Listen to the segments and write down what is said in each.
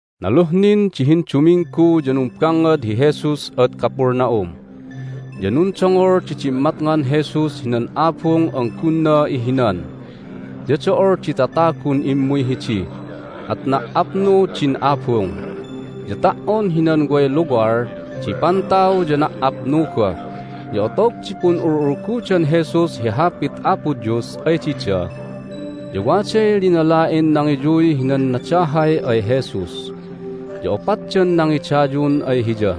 Naluh nin di hinduminggu ya numbangngad hi Jesus ad Capernaum. Ya nundongol di dimmatngan Jesus hinan abung an gunna ihinan. Ya do'ol di tatagun immuy hidi, at na"apnu din abung, ya ta"on hinan way luwal di pantaw ya na"apnu goh. Ya otog di pun'ul'ulgudan Jesus hi Hapit Apo Dios ay dida ya waday linala'in nangiyuy hinan nadahay ay Jesus, ya opatdan nangidayun ay Hiya.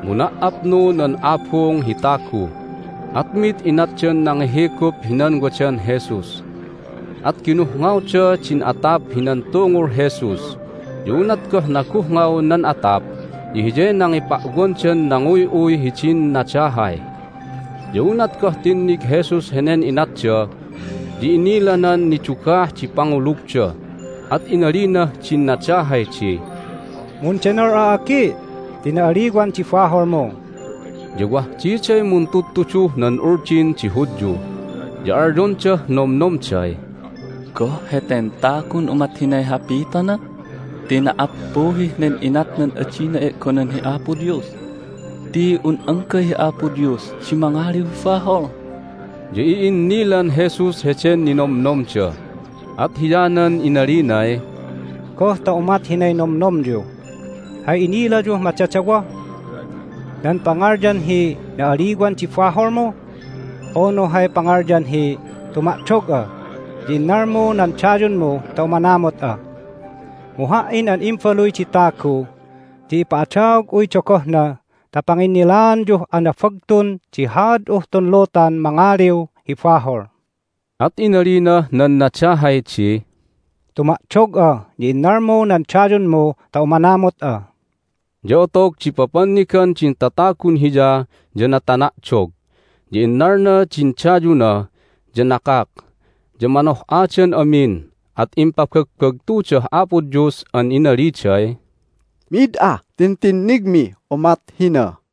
Mu na"apnu nan abung hi tagu, at mid inatdan nangihigup hinan wadan Jesus, at ginuhngawda din atap hinan tungul Jesus. Ya unat goh naguhngaw nan atap ya hiyay nangipa'wandan nanguy'uy hidin nadahay. Ya unat goh tinnig Jesus henen inatda ya inilanan nidugah di pangulugda, at inalinah din nadahay di, "Mundenol'a, agi', ti na'aliwan di baholmu!" Ya wah diday muntudtuduh nan Uldin di Hudyu, ya alyondah nomnomday, "Goh heten tagun umat hinay hapitona? Ti na"appuhih nen inatnan adina e'gonan hi Apo Dios ti un anggay hi Apo Dios di mangaliw hi bahol!" Ya i'innilan Jesus heden ninomnomda, at hiyanan inalinay, "Goh ta umat hinay nomnomonyu? Hay inilayuh madadawoh? Nan pangalyan hi, Na'aliwan di baholmu! unu hay pangalyan hi, Tuma'dog'a, ya innalmu nan dayunmu ta umanamut'a!? Mu Ha"in an Imbaluy di Tagu ya ipa'adaog'uy dogohna ta panginnilaanyuh anabagtun di haad'uh tun lutan mangaliw hi bahol." At inalinah nan nadahay di, "Tuma'dog'a, ya innalmu nan dayunmu ta umanamut'a." Ya otog di papannigan din tatagun hiya ya natana'dog, ya innalna din dayuna, ya nakak. Ya manoh'adan amin, at impabagbagtudah Apo Dios an inaliday, "Mid ah tintinnigmih umat hina!"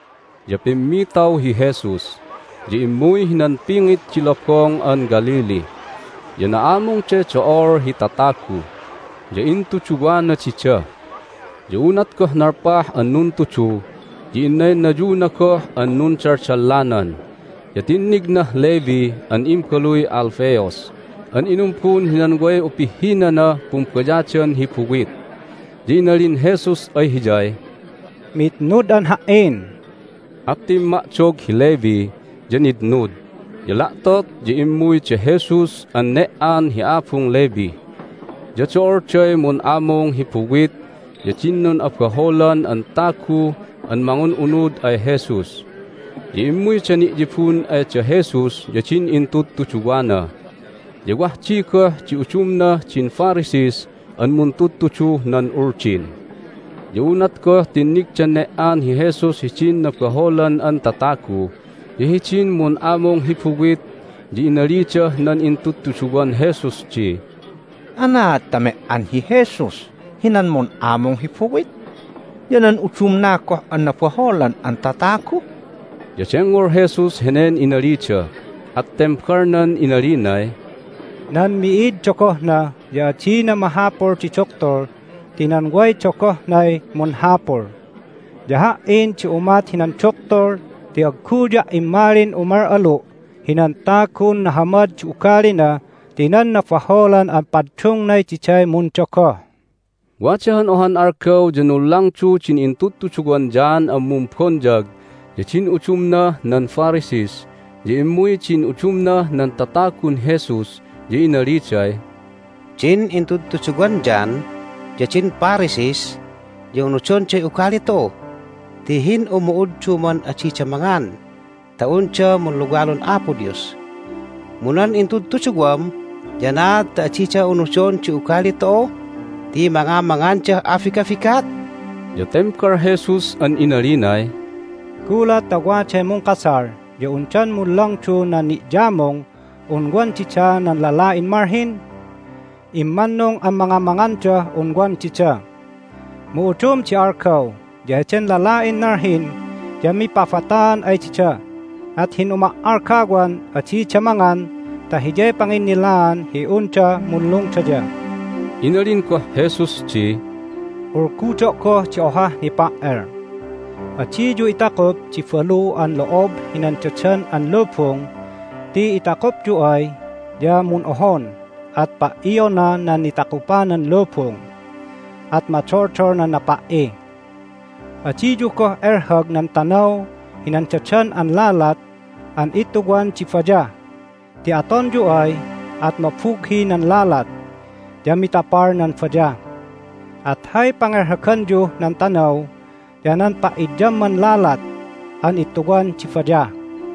Ya pimmitaw hi Jesus, ya immuy hinan pingit di Lobong an Galilee. Ya na'amungday do'ol hi tatagu, ya intuduwana dida. Ya unat goh nalpah an nuntudu ya innaynayuna goh an nundaldallanan, ya tinnignah Levi an imbaluy Alphaeus an inumbun hinan way upihhinanah pumbayadan hi buwit. Ya inalin Jesus ay hiyay, "Mitnud'an Ha"in." At timma'dog hi Levi, ya nitnud. Ya la'tot ya immuy da Jesus an ne"an hi abung Levi. Ya do'olday mun'amung hi buwit ya din nun'abaholan an tagu an mangun'unud ay Jesus. Ya immuyda ni'yibun ay da Jesus ya din intudtuduwana. Ya wah di goh di udumnah din Pharisees an muntudtuduh nan Uldin. Ya unat goh tinnigdan ne"an hi Jesus hidin nabaholan an tatagu ya hidin mun'amung hi buwit ya inalidah nan intudtuduwan Jesus di, "Anaad ta me"an hi Jesus hinan mun'amung hi buwit ya nan udumna goh an nabaholan an tatagu?" Ya dengngol Jesus henen inalida, at tembalnan inalinay, "Nan mi'id dogohna ya adina mahapul di duktul ti nan way dogohnay munhapul. Ya Ha"in di umat hinan duktul ti agguya' immalin umal'alu' hinan tagun nahamad di ugalina ti nan nabaholan an paddungnay diday mundogoh." Wada han ohan algaw ya nunlangdu din intudtuduwan John an Mumbonyag ya din udumnah nan Pharisees. Ya immuy din udumnah nan tatagun Jesus, ya inaliday, "Din intudtuduwan John ya din Pharisees ya unudonday ugali tu'u ti hin'umu'udduman adida mangan ta unda munluwalun Apo Dios. Mu nan intudtuduwam ya anaad ta adida unudon di ugali tu'u ti mangamangandah abigabigat?" Ya tembal Jesus an inalinay, "Gulat ta waday mungkasal ya undan munlangdu nan ni'yamung un wan dida nan lala'in malhin? Immannung an mangamangandah un wan dida. Mu udum di algaw ya heden lala'in nalhin ya mipabataan ay dida, at hin'uma"algawan adida mangan ta hiyay panginnilaan hi unda munlungdaya." Inalin goh Jesus di, "Ulgudo' goh di ohah nipa"el: adiyu itakup di balu an lo'ob hinan dadan an lubung ti itakupyu ay ya mun'ohon, at pa"iona nan nitakupanan lubung, at madoldol nan napa"i. Adiyu goh elhag nan tanaw hinan dadan an lalat an ittuwan di bayah ti atonyu ay at mabughi nan lalat, ya mitapal nan bayah. At hay pangelhaganyuh nan tanaw ya nan pa'idyamman lalat an ittuwan di bayah."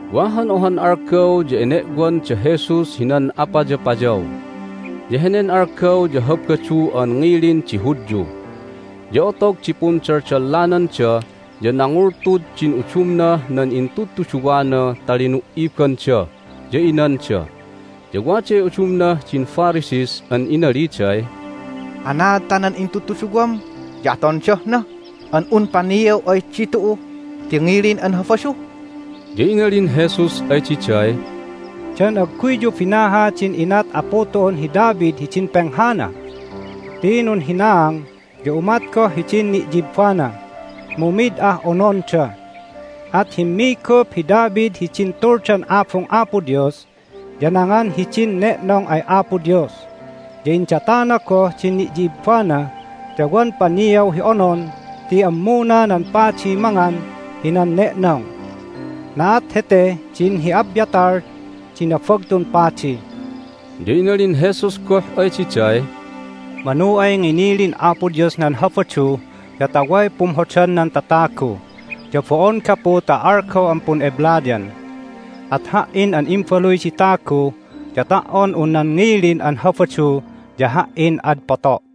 Wa han ohan algaw ya ene'wan da Jesus hinan apayapayaw, ya henen algaw ya Habadu an ngilin di Hudyu. Ya otog di pundaldallananda ya nangultud din udumnah nan intudtuduwana ta linu"ibanda, ya inanda. Ya waday udumnah din Pharisees an inaliday, "Anaad ta nan intudtuduwam ya atondah na an un paniaw ay ditu'u ti ngilin an Habadu?" Ya inalin Jesus ay diday, "Dan agguyyu binaha din inat apu tu'un hi David hidin penghana? Ti nunhinaang, ya umat goh hidin ni'yibbana, mu mid ah ononda. At himmigup hi David hidin Tuldan Abung Apo Dios, ya nangan hidin ne'nong ay Apo Dios, ya indatana goh din ni'yibbana, ya wan paniaw hi onon ti ammuna nan padiy mangan hinan ne'nong. Na'at heteh din hi Abiathar di Nabagtun Padi." Ya inalin Jesus goh ay diday, "Manu ay nginilin Apo Dios nan Habadu ya ta way pumhodan nan tatagu, ya bo'on gapu ta algaw an pun'eblayan. At Ha"in an Imbaluy di Tagu ya ta"on un nan ngilin an Habadu ya Ha"in ad poto'."